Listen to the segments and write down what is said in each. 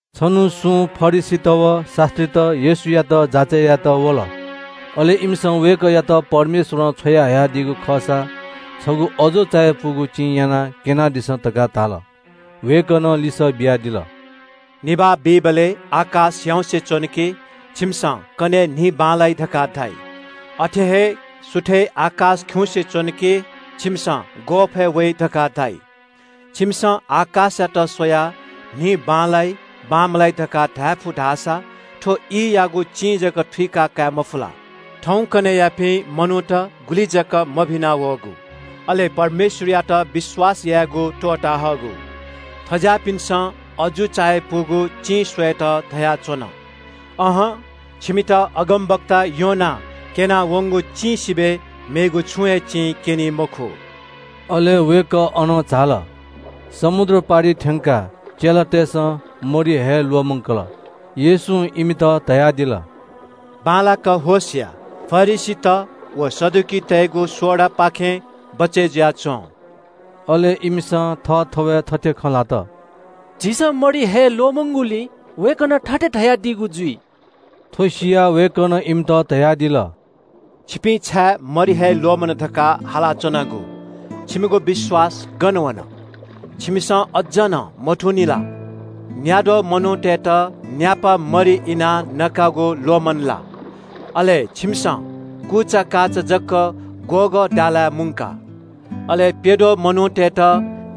छन्हु सुं फरिसीत व शास्त्रीत येशूयात जाँचय् यायेत वल। अले इमिसं वय्कःयात परमेश्वरं छ्वयाहयादीगु खःसा छगू अजू चायापुगु चिं यानाः क्यनादिसँ धकाः धाल। वय्कलं लिसः बियादिल – “निभाः बीबलय् आकाश ह्याउँसे च्वन कि छिमिसं ‘कन्हय् दिं बांलाइ’ धकाः धाइ। अथे हे सुथय् आकाश खिउँसे च्वन कि छिमिसं ‘ग्वःफय् वइ’ धकाः धाइ। छिमिसं आकाशयात स्वयाः थौंयागु दिं गथे जुइ धकाः धायेफु धाःसा थ्व ईयागु चिं जक थुइका कायेमफु ला? थौंकन्हय्यापिं मनूत गुलि जक मभिना वःगु, अले परमेश्वरयात विश्वास यायेगु त्वःता हःगु। थज्याःपिन्सं अजू चायापुगु चिं स्वयेत धयाच्वन। अहं, छिमित अगमवक्ता योनां क्यना वंगु चिं सिबय् मेगु छुं हे चिं क्यनी मखु।” अले वय्कः अनं झाल। समुद्र पारिइ थ्यंकाः चेलातय्सं मरि हये ल्वःमंकल। येशूं इमित धयादिल – “बांलाक होश या, फरिसीत व सदुकीतय्गु सोडापाखें बचय् जुयाच्वँ।” अले इमिसं थःथवय् थथे खँ ल्हात – “झीसं मरि हये ल्वःमंगुलिं वय्कलं थथे धयादीगु जुइ।” थ्व सियाः वय्कलं इमित धयादिल – “छिपिं छाय् मरि हये ल्वःमन धकाः हालाच्वनागु? छिमिगु विश्वास गन वन? छिमिसं अज्ज नं मथूनि ला? न्याद्वः मनूतय्त न्यापा मरि इनाः नकागु ल्वःमन ला? अले छिमिसं कुचाकाचा जक ग्वःगः दालाय् मुंका? अले प्यद्वः मनूतय्त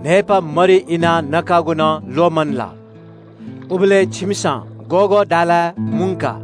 न्हय्पाः मरि इनाः नकागु नं ल्वःमन ला? उबलय् छिमिसं ग्वःगः दालाय् मुंका?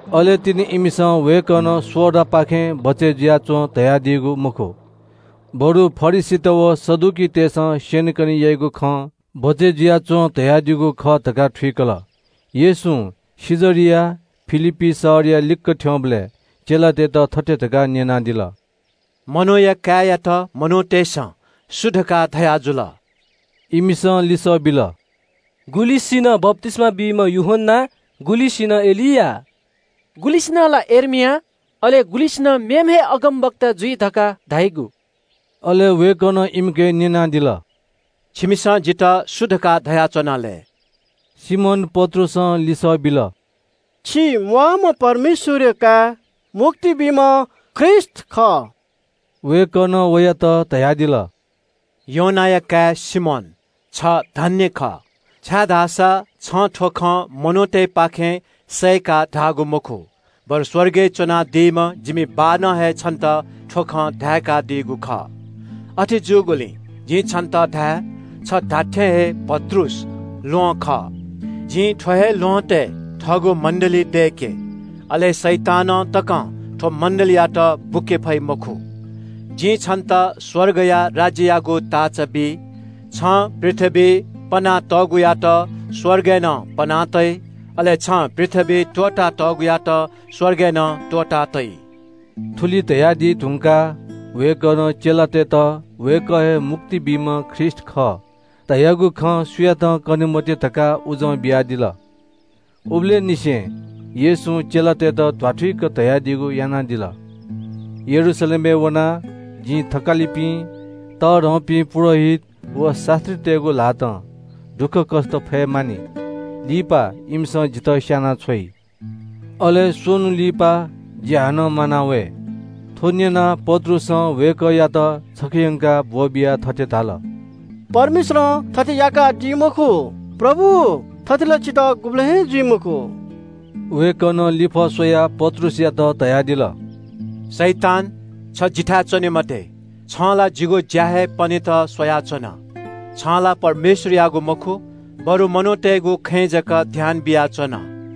अले तिनि इमिसं वय्कलं सोडापाखें बचय् जुयाच्वँ धयादीगु मखु, बरु फरिसीत व सदुकीतय्सं स्यनेकने याइगु खं बचय् जुयाच्वँ धयादीगु खः धकाः थुइकल। येशूं कैसरिया फिलिप्पी शहरया लिक्क थ्यंबलय् चेलातय्त थथे धकाः न्यनादिल – “मनूया काय्यात मनूतय्सं सु धकाः धयाजुल?” इमिसं लिसः बिल – “गुलिसिनं बप्तिस्मा बीम्ह यूहन्ना, गुलिसिनं एलिया, गुलिसिनं ला यर्मिया, अले गुलिसिनं मेम्ह हे अगमवक्ता जुइ धकाः धाइगु।” अले वय्कलं इमिके न्यनादिल – “छिमिसं जितः सु धकाः धयाच्वना लय्?” सिमोन पत्रुसं लिसः बिल – “छि म्वाःम्ह परमेश्वरया काय्, मुक्ति बीम्ह ख्रीष्ट खः।” वय्कलं वयात धयादिल – “योनाया काय् सिमोन, छ धन्य खः, छाय्धाःसा छं थ्व खँ मनूतय्पाखें सय्काः धाःगु मखु, बरु स्वर्गय् च्वनादीम्ह जिमि बाःनं हे छन्त थ्व खँ धाय्कादीगु खः। अथे जूगुलिं जिं छन्त धाये, छ धात्थें हे पत्रुस ल्वहं खः। जिं थ्व हे ल्वहँतय् थःगु मण्डली मण्डली थुकियात ग्रीक भाषां एकलेसिया धाइ दय्के। अले शैतानं तकं थ्व मण्डलीयात बुके फइ मखु। जिं छन्त स्वर्गया राज्ययागु ताःचा बी। छं पृथ्वीइ पना तःगुयात स्वर्गय् नं पना तइ, अले छं पृथ्वीइ त्वःता तःगुयात स्वर्गय् नं त्वःता तइ।” थुलि धयादी धुंकाः वय्कलं चेलातय्त वय्कः हे मुक्ति बीम्ह ख्रीष्ट खः धयागु खँ सुयातं कने मते धकाः उजं बियादिल। उबलय् निसें येशूं चेलातय्त ध्वाथुइक धयादीगु यानादिल – “यरूशलेमय् वनाः जिं थकालिपिं, तःधंपिं पुजाहारीत व शास्त्रीतय्गु ल्हातं दुःखकष्ट फये मानि। लिपा इमिसं जितः स्यानाछ्वइ। अले स्वन्हु लिपा जि हानं म्वाना वये।” थ्व न्यनाः पत्रुसं वय्कःयात छखे यंकाः ब्वःबियाः थथे धाल – “परमेश्वरं थथे याकादी मखु, प्रभु, थथे ला छितः गुबलें हे जुइ मखु।” वय्कलं लिफः स्वयाः पत्रुसयात धयादिल – “शैतान, छ जिथाय् च्वने मते। छं ला जिगु ज्या हे पनेत स्वयाच्वन। छं ला परमेश्वरयागु मखु, बरु मनूतय्गु खँय् जक ध्यान बियाच्वन।”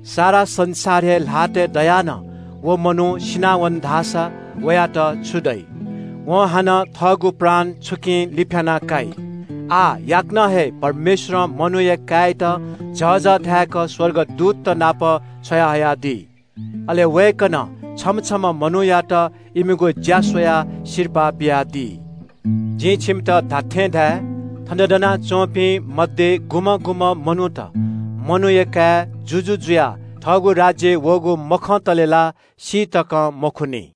सारा संसार हे ल्हातय् दयाः नं व मनू सिनावन धाःसा वयात छु दइ? वं हानं थःगु प्राण छुकिं लिफ्याना काइ? आः याकनं हे परमेश्वरं मनूया काय्यात झःझः धाय्क स्वर्गदूतत नाप छ्वयाहयादी। अले वय्कलं छम्ह छम्ह मनूयात इमिगु ज्या स्वयाः सिरपाः बियादी। जिं छिमित खःगु खँ धाये – थन दनाच्वंपिं मध्ये गुलिखय् मनूत मनूया काय् जुजु जुयाः थःगु राज्यय् वःगु मखंतले ला सी तकं मखुनि।”